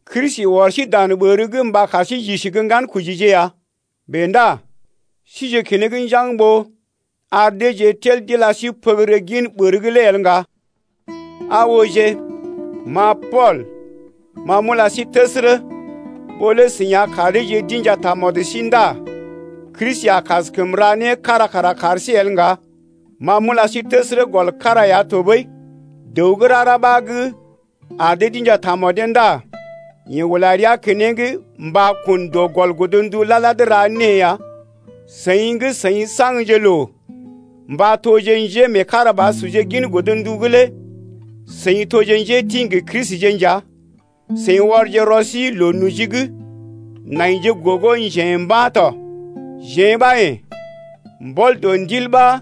Kristi ɔr sí dan ɓər’g mba kar sí j’isi gə́ ŋgankojije ya. Bèe ndá sije keneŋ njaŋg ɓó ar deeje tel d’ila sí pəgərə gin ɓər’g lé el ŋga. Aa ooje, ma Pool ma m’ula sí təsərə, ɓó lé seḭ a kar deeje d’inja tamɔd sí ndá Kristi a kaskəm ra né kára kara kar sí el ŋga. Ma m’ula sí təsərə gɔl kára ya tɔɓəi, dəw gə́ rara ɓa gə́ ar dee d’inja tamɔdee ndá yeḛ ula rəa keneŋ mba kun dɔ gɔl godndu lad-lad ra née ya. Seḭ gə́ seḭ saŋgje loo mba toje njémeekarabasurje gin godndu’g lé seḭ toje njétḭ gə Kristije nja, seḭ ɔrje rɔ sí loo noji’g naije gogo njḛ̀ mba̰ tɔ. Jeḛ ɓa yḛ̀, mbɔl dɔ Ndil ɓa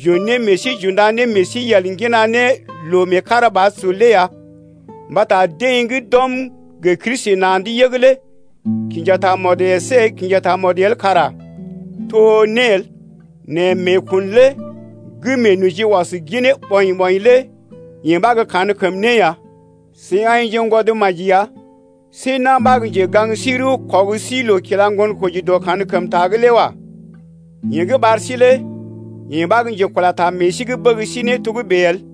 j’un ne meḛ sí j’unda ne meḛ sí yel, ŋgina ne loo meekarabasur lé ya. Mbata deḛ gə́ d’ɔm gə Kristi na̰’d yəg lé kinja tamɔd əsé kinja tamɔd el kara to né el, nɛ meekun lé gə́ meenoji ɔs ginee ɓɔḭ-ɓɔḭ lé yee ɓa gə́ kankəm né ya. Seḭ aḭjengwɔd maji ya. See na̰ ɓa gə́ njegaŋ sí rəw ɔg sí loo kila ŋgonkoji dɔ kankəmta’g lé wa. Yeḛ gə́ ɓar sí lé yeḛ ɓa gə́ njekula ta meḛ sí’g bəg sí ne togə́bè el.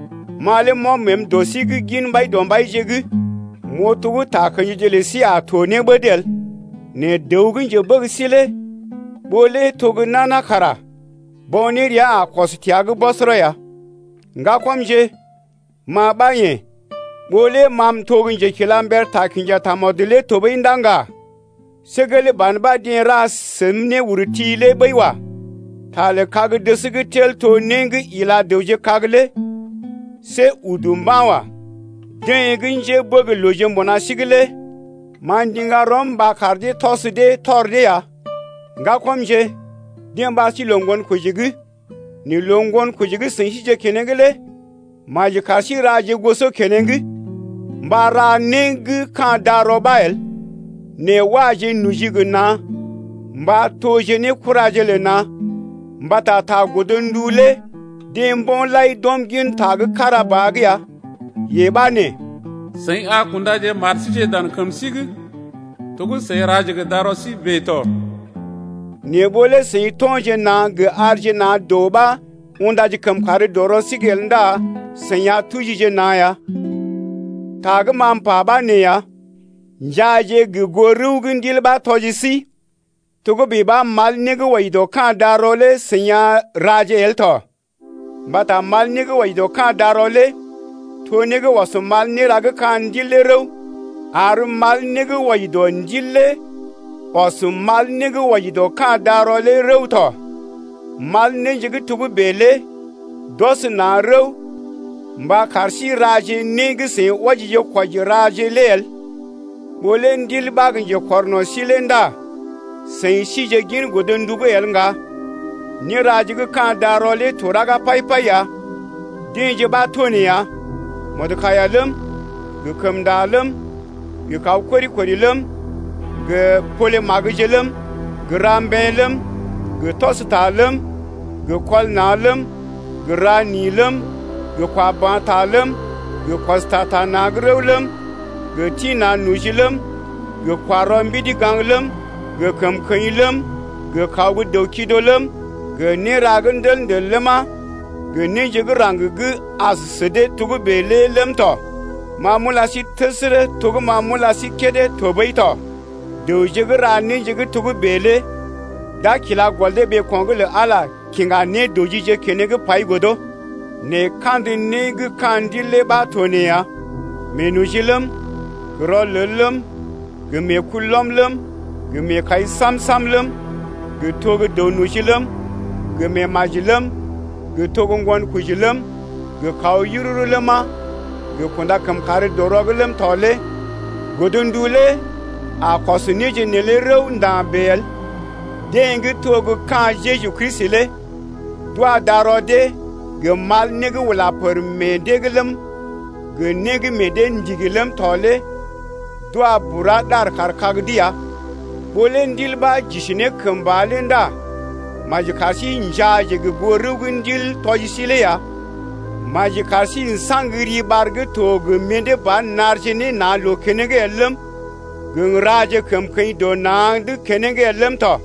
Ma lé m’ɔm məəm dɔ sí’g gin Mbaidɔmbaije’g m’oo to gə́ takə̰jije lə sí a to ne ɓəd el. Nɛ dəw gə́ njebəg sí lé ɓó lé to gə́ nana kara bo̰ nérea a kɔs təa’g bɔsɔrɔ ya. Ŋgakɔmje, ma ɓa yḛ̀, ɓó lé ma m’to gə́ njekilamber ta kinja tamɔd lé tɔɓəi ndá ŋga, see gelee ban ɓa deḛ ra səm néurti lé ɓəi wa. Ta lə kag-dəs gə́ tel to né gə́ ila dəwje kag lé see udu mba̰ wa. Deḛ gə́ njébəglooje mbuna sí’g lé ma m’ndiŋga rɔm mba kar dee tɔs dee tɔr dee ya. Ŋgakɔmje, deḛ ɓar sí loo ŋgonkoji’g, nɛ loo ŋgonkoji gə́ seḭ sije keneŋ lé maji kar sí raje goso keneŋ mba ra né gə́ ka̰ darɔ ɓa el. Nɛ waje noji gə na̰ mba toje ne kuraje lə na̰. Mbata ta godndu lé deḛ mbo̰ lai d’ɔm gin ta gə́ kára ba’g ya, yee ɓa nee: Seḭ a kundaje mar síje dan kəm sí’g to gə́ seḭ raje gə darɔ sí bèe tɔ. Nɛ ɓó lé seḭ to̰je na̰ gə arje na̰ doo ɓa undaje kəmkàr dɔ rɔ sí’g el ndá seḭ a tujije na̰ ya. Ta gə́ ma m’pa ɓa nee ya: Njaaje gə goo rəw gə́ Ndil ɓa tɔji sí, togə́bè ɓa mal né gə́ wɔji dɔ ka̰ darɔ lé seḭ a raje el tɔ. Mbata mal né gə́ wɔji dɔ ka̰ darɔ lé to né gə́ ɔs mal néra gə́ ka̰ Ndil lé rəw, ar mal né gə́ wɔji dɔ Ndil lé ɔs mal né gə́ wɔji dɔ ka̰ darɔ lé rəw tɔ, mal néje gə́ togə́bè lé d’ɔs na̰ rəw mba kar sí raje né gə́ seḭ wɔjije-kwɔji raje lé el. Ɓó lé Ndil ɓa gə́ njekɔrno̰ sí lé ndá seḭ sije gin godndu’g el ŋga. Néraje gə́ ka̰ darɔ lé to raga pai-pai ya, deḛje ɓa to nee ya: Mɔdkaiya ləm, gə kəmnda ləm, gə kaw kori-kori ləm, gə pole magəje ləm, ra mbeḛ ləm, gə tɔs ta ləm, gə kɔl na̰ ləm, gə ra ni ləm, gə kwa ba̰ ta ləm, gə kɔs ta ta na̰’d rəw ləm, gə tḭ na̰ noji ləm, gə kwa rɔ mbidi gaŋg ləm, gə kəmkəḭ ləm, gə kaw gə́ dəw-kido ləm, gə néra gə́ ndəl-ndəl ləma, gə néje gə́ raŋg gə́ as sə dee togə́bè lé ləm tɔ. Ma m’ula sí təsərə to gə́ ma m’ula sí kédé tɔɓəi tɔ, dəwje gə́ ra néje gə́ togə́bè lé d’a kila gɔl dee ɓeeko̰’g lə Ala kiŋga nédɔjije keneŋ pai godo. Nɛ kandə né gə́ ka̰ Ndil lé ɓa to nee ya: Meenoji ləm, gə rɔlel ləm, gə meekulɔm ləm, gə meekai sam-sam ləm, gə to gə́ dəw-noji ləm, gə meemaji ləm, gə to gə́ ŋgonkoji ləm, gə kaw yururu ləma, gə kunda-kəmkàr-dɔ-rɔ’g ləm tɔ lé godndu lé a kɔs néje neelé rəw nda̰ bèe el. Deḛ gə́ to gə́ ka̰ Jeju Kristi lé d’wa darɔ dee gə mal né gə́ ula pər meḛ dee’g ləm, gə né gə́ meḛ dee ndigi ləm tɔ lé d’wa bura ɗar kaar kag’d ya. Ɓó lé Ndil ɓa j’isi ne kəmba lé ndá maji kar sí njaaje goo rəw gə́ Ndil tɔji sí lé ya. Maji kar sí n’saŋgje riɓar gə́ to gə mḭdé ba narje ne na̰ loo keneŋ el ləm, gə n’raje kəmkəḭ dɔ na̰’d keneŋ el ləm tɔ.